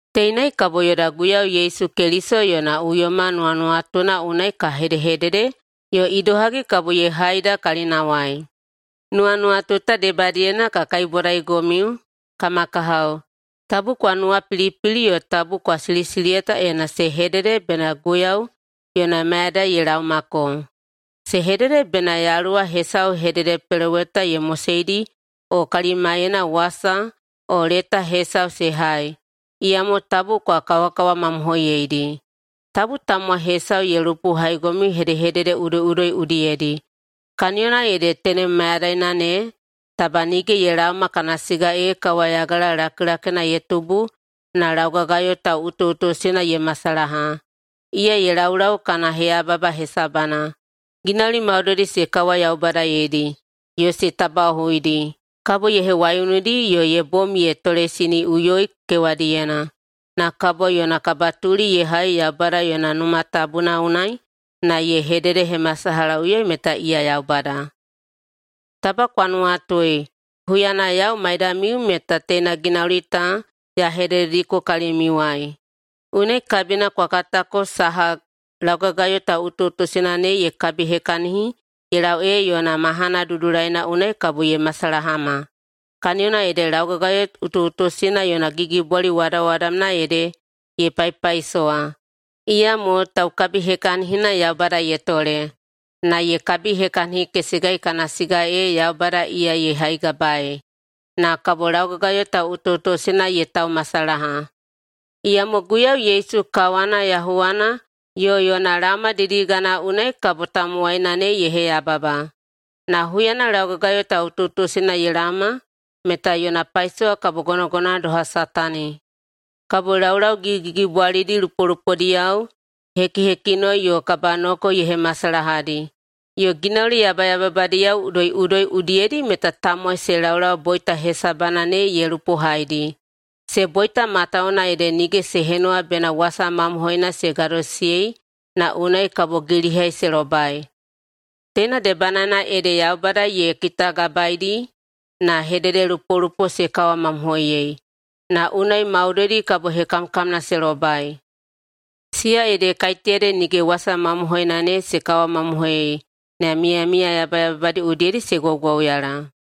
Teinai kabo yoda Guiyau Yesu Keliso yona uyoma nuwanuwatuna unai ka hedehedede yo idohagi kabo ye haida kalinawai. Nuwanuwatu ta debadiyena ka kaibwadaigomiu, kama kahao, tabu kwa nuwapilipili yo tabu kwa silisiliyata ena se hedede bena Guiyau yona mayadai ye laomako. Se hedede bena yaluwa hesau [hededepeloweta] ye moseidi o kalimaiyena wasa o leta hesau se hai, iyamo tabu kwa kawakawamamohoiyeidi. Tabu tamowai hesau ye lupohaigomiu hedehedede udoiꞌudoi udiyedi, kaniyona ede tenem mayadaina ne taba nige ye laoma kana siga ee kawayagala lakilakina ye tubu na laugagayo tauꞌutuꞌutusina ye masalaha, iya ye laulau kana heyababa hesabana. Ginauli maudoidi se kawayaubadayeidi yo se tabaꞌohuidi kabo ye hewaiunudi yo ye bom ye toleisiniꞌuyoi kewadiyena, na kabo yona kabatuli ye hai Yaubada yona Numa Tabuna unai na ye hededehemasalahaꞌuyoi meta iya Yaubada. Taba kwa nuwatui, huyana yau maidamiu meta teina ginauli ta ya hededediko kalimiuwai. Unai kabina kwa katako saha laugagayo tauꞌutuꞌutusina ne ye kabihekahini ye lau ee yona mahana dudulaina unai kabo ye masalahama. Kaniyona ede laugagayo utuꞌutusina yona gigibwali wadawadamna ede ye paipaisowa, iyamo taukabihekahinina Yaubada ye tole. Na ye kabihekahinikesegai kana siga ee Yaubada iya ye haigabaei. Na kabo laugagayo tauꞌutuꞌutusina ye taumasalaha, iyamo Guiyau Yesu kawana yahuwana yo yona laoma didigana unai kabo tamowaina ne ye heyababa. Na huyana laugagayo tauꞌutuꞌutusina ye laoma meta yona paisowa kabo gonogonowana doha Satani. Kabo laulau gigigigibwalidi lupolupodiyao, hekihekinoi yo kabanoko ye hemasalahadi, yo ginauli yabayababadiyao udoiꞌudoi udiyedi meta tamowai se laulau boita hesabana ne ye lupohaidi. Se boita matawuwuna ede nige se henuwa bena wasa mamohoina se gadosisiyei na unai kabo gilihai se lobai. Teina debanaena ede Yaubada ye kitagabaedi na hededelupolupo se kawamamohoiyei, na unai maudoidi kabo hekamkamna se lobai, siya ede kaiteyadi nige wasa mamohoina ne se kawamamohoiyei na miyamiya yabayababadi udiyedi se gwaugwauyala.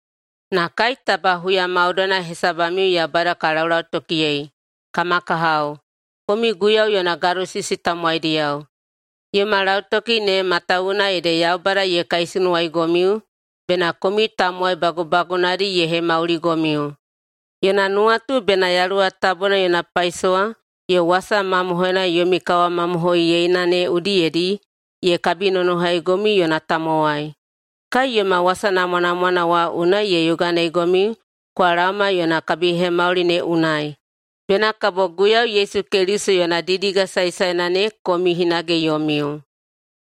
Na kai taba huya maudoina hesabamiu Yaubada ka laulautokiyei, kama kahao, komiu Guiyau yona gadosisi tamowaidiyao. Yoma lautoki ne matawuwuna ede Yaubada ye kaisunuwaigomiu bena komiu tamowai bagubagunadi ye hemauligomiu. Yona nuwatu bena Yaluwa Tabuna yona paisowa yo wasa mamohoina yomi kawamamohoiyeina ne udiyedi ye kabinonohaigomiu yona tamowai. Kai yoma wasa namwanamwana wa unai ye yoganeigomiu kwa laoma yona kabihemauli ne unai, bena kabo Guiyau Yesu Keliso yona didiga saesaena ne komiu hinage yomiu.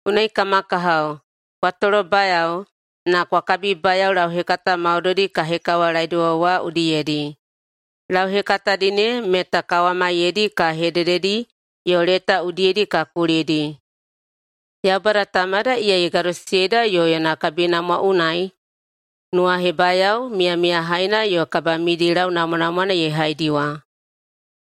Unai, kama kahao, kwa tolobayao na kwa kabibayao lauhekata maudoidi ka hekawalaediwa wa udiyedi. Lauhekatadi ne meta kawamaiyedi ka hedededi yo leta udiyedi ka kulidi. Yaubada Tamada, iya ye gadosisiyeida, yo yona kabinamwa unai nuwahebayao miyamiyahaina yo kabamidilau namwanamwana ye haidiwa.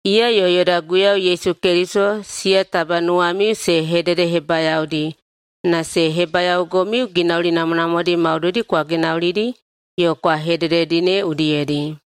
Iya yo yoda Guiyau Yesu Keliso, siya taba nuwamiu se hededehebayaodi na se hebayaogomiu ginauli namwanamwadi maudoidi kwa ginaulidi yo kwa hedededi ne udiyedi.